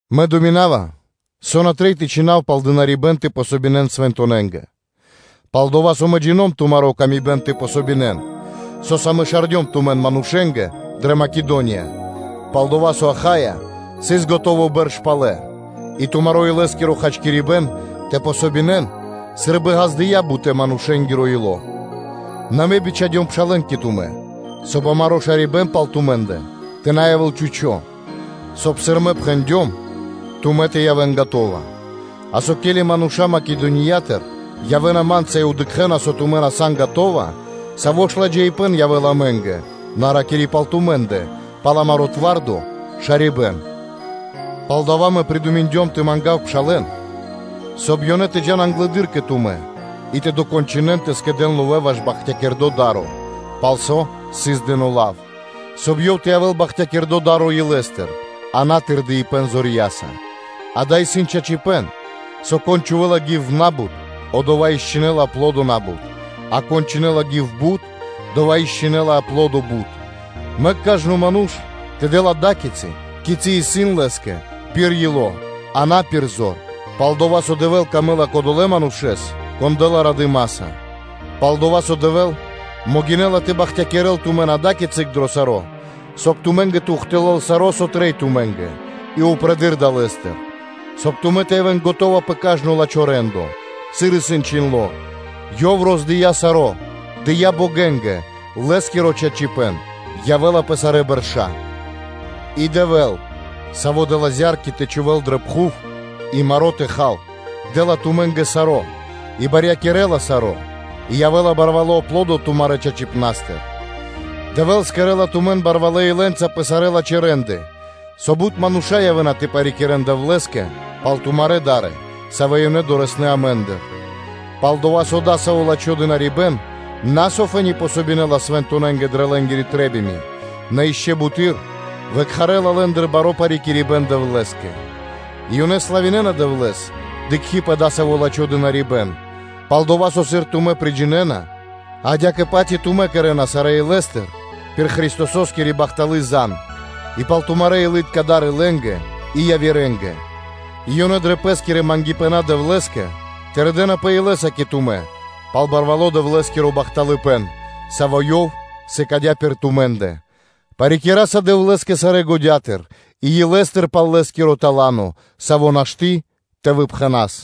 Мэ думинава, со на трэй тэ чхинав пал дынарибэ́н (служэниё) тэ дэн васт свэнтонэнгэ; пал-дова́ со мэ джино́м тумаро́ хачкирибэ́н тэ помогинэн (тэ дэн васт), со́са мэ шардём тумэн манушэ́нгэ дрэ Македония, пал дова́, со Ахаия Ахаия – основание сыс скэдыно́ бэрш палэ и тумаро́ илэ́скиро хачкирибэ́н тэ дэн васт сы́рбы ґаздыя́ бутэ́-манушэ́нгиро ило́. Нэ мэ бичхадём пшалэ́н кэ тумэ́, соб (кай) амаро́ шарибэ́н пал тумэ́ндэ тэ на явэ́л чхучо́ (пусто), соб (кай), сыр мэ пхэндём, тумэ́ тэ явэ́н скэдынэ́, а со, ке́ли мануша́ Македониятыр явэ́на ма́нца и дыкхэ́на, со тумэ́ на сан скэдынэ́, саво́ ж ладжаипэ́н явэ́ла амэ́нгэ (на ракири́ пал тумэ́ндэ) пал амаро́ твардо шарибэ́н. Палдава́ мэ придуминдём тэ мангав пшалэ́н, соб (кай) ёнэ тэ джа́н англэды́р кэ тумэ́ и тэ докончынэн тэ скэдэ́н ловэ́ ваш бахтякирдо́ да́ро, пал со сыс дыно́ лав, соб (кай) ёв тэ явэ́л бахтякирдо́ да́ро илэ́стыр, а на сы́рбы тырдэна зорья́са. Дава́ исын чачипэ́н, со, кон чхувэ́ла гив на́бут, одова́ и кэдэла аплодо на́бут, а кон чхувэ́ла гив бут, одова́ и кэдэла аплодо бут: мэк кажно ману́ш тэ дэл ада́кицы, кицы́ исын лэ́скэ пир ило́, а на пир зор; пал-дова́ со Дэвлэ́скэ исын дро́го кодова́ ману́ш, кон дэ́ла радыма́са. Палдова́ со Дэвэ́л могинэ́ла тэ бахтякирэ́л тумэн ада́кицы дро саро́, соб (кай) тумэ́ндэ тэ ухтылэл (тэ явэ́л до́си) саро́, со трэй тумэ́нгэ, и упрэдыр далэ́стыр, соб (кай) тумэ́ тэ явэ́н скэдынэ́ пэ кажно лачхо́ рэ́ндо: сыр исын чхиндло́: “Ёв роздыя саро́, дыя́ богэнгэ, Лэ́скиро чачипэ́н явэ́ла пэ сарэ́ бэрша́.” И Дэвэ́л, Саво́ дэ́ла зя́рки тэ чхувэ́н дрэ пхув и маро́ тэ хан, дэ́ла тумэ́нгэ саро́ и барьякирэ́ла саро́ и явэ́ла барвало́ аплодо тумарэ́ чачипнастыр: Дэвэ́л кэрэ́ла тумэн барвалэ́ илэ́нца пэ сарэ́ лачхэ́ рэ́нды, со бут мануша́ явэ́на тэ парикирэ́н Дэвлэ́скэ пал тумарэ́ да́ры, савэ́ ёнэ дорэсэ́на (долэна) амэ́ндыр. Пал-дова́ со дасаво лачхо́ дынарибэ́н на со фэ́ни помогинэла свэнтонэнгэ дрэ лэ́нгири трэ́бима, нэ ишчо (инкэ́) бутэды́р выкхарэла лэ́ндыр баро́ парикирибэн Дэвлэ́скэ; и ёнэ славинэна Дэвлэ́с, дыкхи́ пэ дасаво лачхо́ дынарибэ́н, пал-дова́ со, сыр тумэ́ приджинэна, адя́кэ-паць и тумэ́ кэрэ́на сарэ́ илэ́стыр пир Христососкири бахталы́ зан (звесь); и пал тумарэ́ илы́тка да́ры лэ́нгэ и явирэ́нгэ, и ёнэ дрэ пэ́скирэ патерья (молитвы) Дэвлэ́скэ тырдэнапэ илэ́са кэ тумэ́ пал барвало́ Дэвлэ́скиро бахталыпэ́н, саво́ Ёв сыкадя́ пир тумэ́ндэ. Парикираса Дэвлэ́скэ сарэ́ годятыр и илэ́стыр пал Лэ́скиро тала́но, саво́ нашты́ тэ выпхэнас.